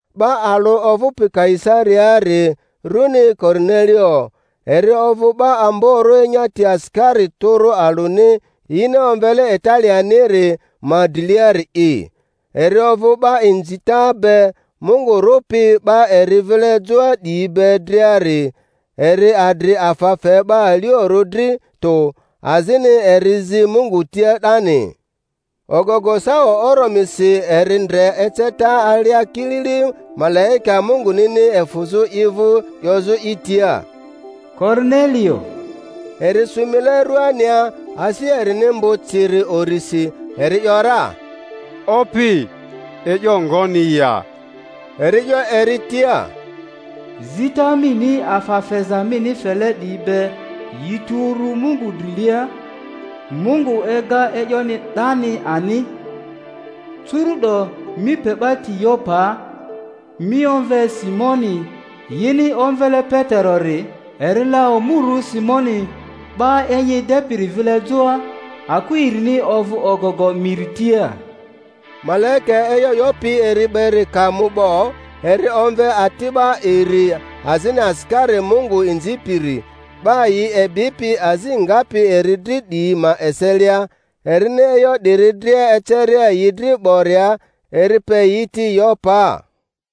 'Ba alᴜ ovᴜpi Kaisariaari, runi Korinelio, eri ovᴜ 'ba amborᴜ enyati asikari tᴜrᴜ alᴜni yini omvele Italianiri ma driliari'i. Eri ovᴜ 'ba inzita be Mungu rᴜpi 'ba eri vile joa 'diyi be driari, eri adri afa fe 'ba aliorᴜ dri tᴜ, azini eri zi Mungu tia 'dani. Ogogo sawa oromirisi eri ndre eceta alia kilili malaika Mungunini efᴜzᴜ i vᴜ 'yozᴜ i tia, Korinelio! Eri sᴜ mile ruania, asi erini mbᴜ ciri urisi, eri ‘yora, Opi, e'yo ngoni ya? Eri 'yo eri tia, Zita mini afa feza mini fele 'diyi be yi tu uru Mungu drilia, Mungu ega e'yoni 'dani ani. Curu'do mi pe 'ba ti Yopaa, mi omve Simoni yini omvele Peterori; eri la omurᴜ Simoni 'ba enyi edepiri vile joa, akᴜ erini ovᴜ ogogo miri tia. Malaika e'yo 'yopi eri beri ka mu 'bo, eri omve ati'ba iri azini asikari Mungu inzipiri, 'ba yi ebipi azi ngapi eri dri 'diyi ma eselia; erini e'yo 'diri dria eceria yi dri 'boria, eri pe yi ti Yopaa.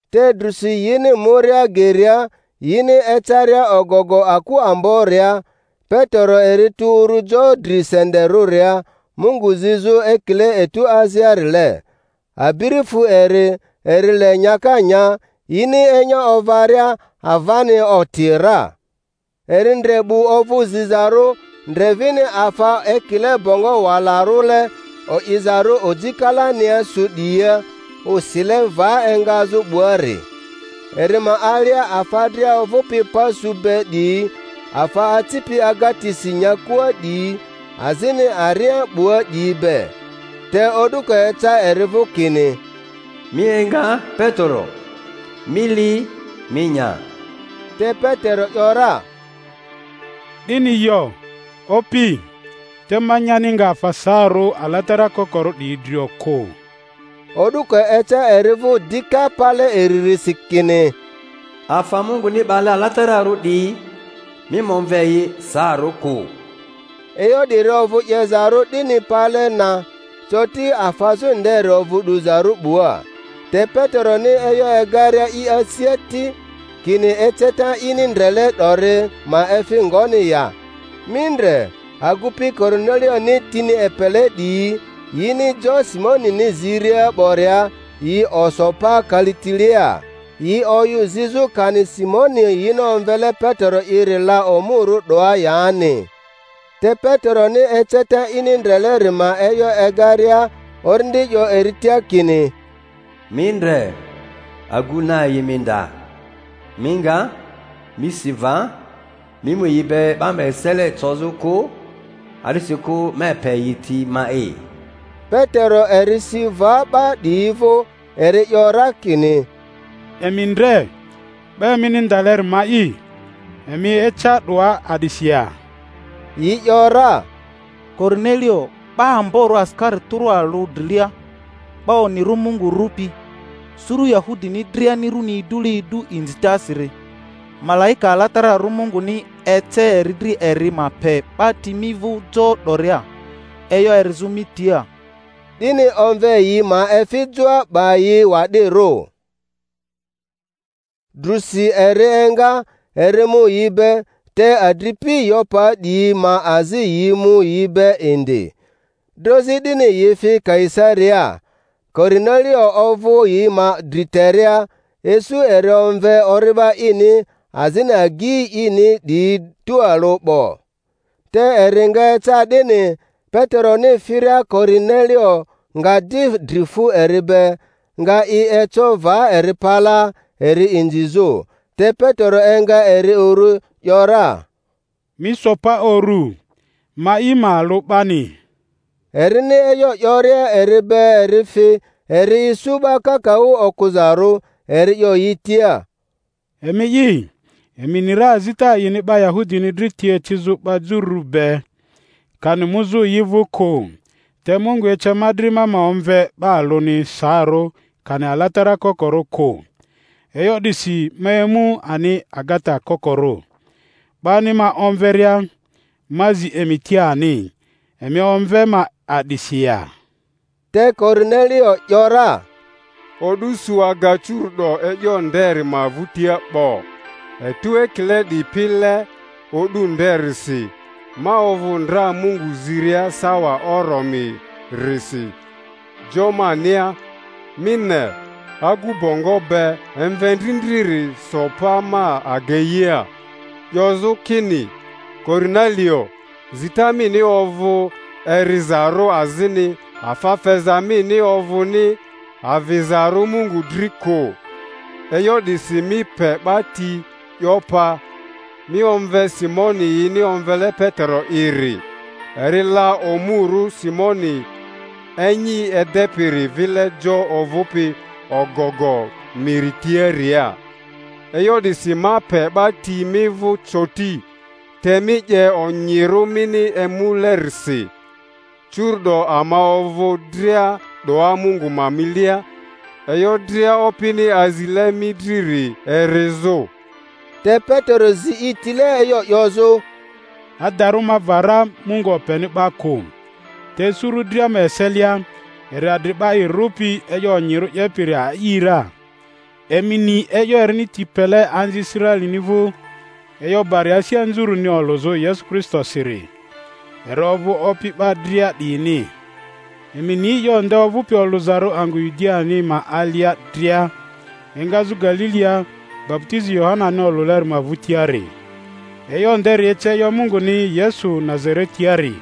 Te drusi yini muria geria^ yini ecaria ogogo aku amboria, Petero eri tu uru jo dri senderᴜria Mungu zizᴜ, ekile etu aziarile. Abiri fu eri, eri le nyaka nya; yini enya ovaria, avani oti ra, eri ndre 'bu ovᴜ zizarᴜ, ndre vini afa ekile bongo walarᴜle, o'izarᴜ oji kalania su 'diyia, osile va engazᴜ 'buari. Eri ma alia afa dria ovᴜpi pa su be 'diyi, afa acipi agatisi nyakua 'diyi, azini aria 'bua 'diyi be. Te o'duko eca eri vᴜ kini, Mi enga, Petero; mi li, mi nya. Te Petero ‘yora, 'Dini yo, Opi; te ma nyani nga afa saarᴜ alatara kokorᴜ 'diyi drio kᴜ. O'duko eca eri vᴜ dika pale iririsi kini, Afa Munguni 'bale alatararᴜ 'diyi, mi ma omve yi saarᴜ kᴜ. E'yo 'diri ovᴜ 'yezarᴜ 'dini pale na, coti afazᴜ nderi ovᴜ 'duzarᴜ 'bua. Te Peteroni e'yo egaria i asia ti, kini eceta ini ndrele 'dori ma efi ngoni ya, mi ndre, agupi Korinelioni tini epele 'diyi, yini jo Simonini ziria 'boria, yi oso pa kalitilea. Yi oyᴜ zizᴜ kani Simoni yini omvele Petero'iri la omurᴜ 'doa yani. Te Peteroni eceta ini ndreleri ma e'yo egaria, Orindi 'yo eri tia kini, Mi ndre, agu na yi mi nda. Mi nga, mi si va, mi mu yi be 'ba ma esele cozᴜ kᴜ, a'disikᴜ ma epe yi ti ma'i. Petero eri si va 'ba 'diyi vᴜ, eri 'yo ra kini, Emi ndre, 'ba emini ndaleri ma'i; emi eca 'doa a'disi ya? Yi ‘yora, Korinelio 'ba amborᴜ asikari tᴜrᴜ alᴜ drilia, 'ba onyirᴜ Mungu rᴜpi, suru Yahudini driani runi idule idu inzitasiri, malaika alatararᴜ Munguni ece eri dri eri ma pe 'ba ti mi vᴜ jo 'doria, e'yo erizᴜ mi tia. 'Dini omve yi ma efi joa, 'ba yi wa'dirᴜ. Drᴜsi eri enga, eri mu yi be, te adripi Yopaa 'diyi ma azi yi mu yi be indi. Drozi 'dini yi fi Kaisariaa. Korinelio ovᴜ yi ma dri teria, isu eri omve ori'ba ini azini agyi ini 'diyi tualᴜ 'bo. Te eri nga eca 'dini, Peteroni firia Korinelio nga di dri fu eri be, nga i eco va eri palaa eri inzizᴜ. Te Petero enga eri uru, ‘yora, Mi so pa uru; ma'i ma alᴜ 'bani. Erini e'yo 'yoria eri be eri fi, eri isu 'ba kakaᴜ okᴜzarᴜ; eri 'yo yi tia, Emi'i, emi ni ra azita a'ini 'ba Yahudini dri ti ecizᴜ 'ba jururᴜ be, kani muzᴜ yi vᴜ kᴜ; te Mungu ece ma dri ma ma omve 'ba alᴜni saarᴜ kani alatara kokorᴜ kᴜ. E'yo 'disi ma emu ani agata kokorᴜ, 'bani ma omveria. Ma zi emi tia ani, emi omve ma a'disi ya? Te Korinelio ‘yora, O'du su aga curu'do e'yo nderi ma vᴜtia 'bo. Etu ekile 'dipile o'du nderisi, ma ovᴜ ndra Mungu ziria sawa oromi-risi jo mania; mi ne, agu bongo be emvendrindriri so pa ma ageia 'yozᴜ kini, Korinelio, zita mini ovᴜ erizarᴜ azini afa feza mini ovᴜni avizarᴜ Mungu dri kᴜ. E'yo 'disi mi pe 'ba ti Yopaa, mi omve Simoni yini omvele Petero'iri; eri la omurᴜ Simoni enyi edepiri vile jo ovᴜpi ogogo miri tiaria. E'yo 'disi ma pe 'ba ti mi vᴜ coti, te mi 'ye onyirᴜ mini emulerisi. Curu'do ama ovᴜ dria 'doa Mungu ma milia, e'yo dria Opini azile mi driri erizᴜ. Te Petero zi i tile e'yo 'yozᴜ: Adarᴜ ma va ra Mungu openi 'ba kᴜ, te suru dria ma eselia eri adri 'ba i rᴜpi e'yo onyirᴜ 'yepiri a'i ra. Emi ni e'yo erini ti pele anzi Israelini vᴜ, e'yo bari asi anzurᴜni olᴜzᴜ Yesu Kristosiri (eri ovᴜ Opi 'ba dria 'diyini), emi ni e'yo nde ovᴜpi olᴜzarᴜ angᴜ Yudiani ma alia dria, engazᴜ Galilia baputizi Yohanani olᴜleri ma vᴜtiari. E'yo nderi ece e'yo Munguni Yesu Nazaretiari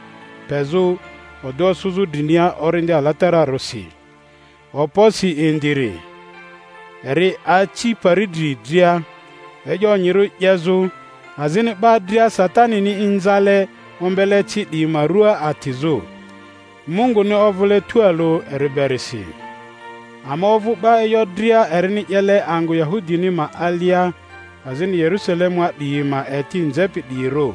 pezᴜ odᴜ osᴜzᴜ drinia Orindi Alatararᴜsi, okposi indiri; eri aci pari dri dria e'yo onyirᴜ 'yezᴜ, azini 'ba dria Satanini inzale ombele ci 'diyi ma rua atizᴜ, Munguni ovᴜle tualᴜ eri berisi. Ama ovᴜ 'ba e'yo dria erini 'yele angᴜ Yahudini ma alia azini Yerusalemua 'diyi ma eti nzepi 'diyirᴜ.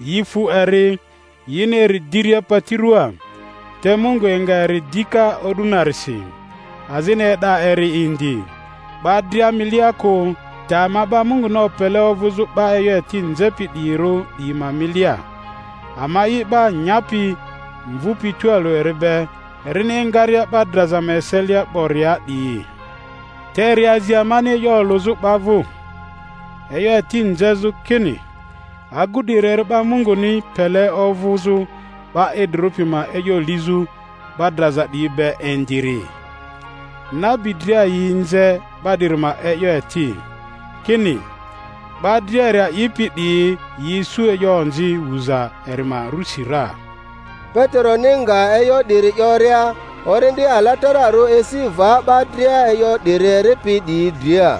Yi fu eri yini eri diria pati rᴜaa; te Mungu enga eri dika o'du narisi, azini e'da eri indi; 'ba dria milia kᴜ, te ama 'ba Munguni opele ovᴜzᴜ 'ba e'yo eti nzepi 'diyirᴜ 'diyi ma milia, ama'i 'ba nyapi mvupi tualᴜ eri be erini engaria 'ba draza ma eselia 'boria 'diyi. Te eri azi amani e'yo olᴜzᴜ 'ba vᴜ, e'yo eti nzezᴜ, kini agu 'diri eri 'ba Munguni pele ovᴜzᴜ 'ba idrirᴜ pi ma e'yo lizᴜ 'ba draza 'diyi be indiri. Nabi dria yi nze 'ba 'diri ma e'yo eti, kini, 'ba dria eri a'ipi 'diyi yi isu e'yo onzi wuza eri ma rusi ra. Peteroni nga e'yo 'diri 'yoria, Orindi Alatararᴜ esi va 'ba dria e'yo 'diri eripi 'diyi dria.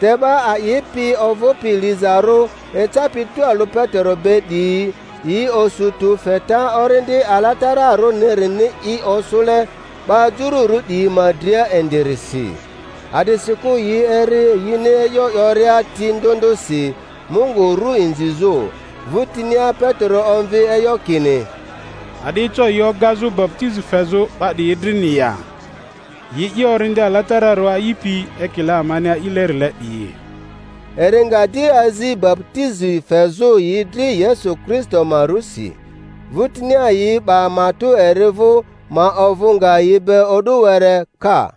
Te 'ba a'ipi ovᴜpi lizarᴜ ecapi tualᴜ Petero be 'diyi yi osu tᴜ feta Orindi Alatararᴜnirini i osᴜle 'ba Jururᴜ 'diyi ma dria indirisi. A'disikᴜ yi eri yini e'yo 'yoria ti ndᴜ ndᴜsi Mungu ru inzizᴜ. Vᴜtinia Petero omvi e'yo kini, A'di eco yi ogazᴜ baputizi fezᴜ 'ba 'diyi drini ya, yi'i Orindi Alatararᴜ a'ipi ekile amani a'ilerile 'diyi? Eri nga di azi baputizi fezᴜ yi dri Yesu Kristo ma rusi. Vᴜtinia yi 'ba matᴜ eri vᴜ ma ovᴜ nga yi be o'du were ka.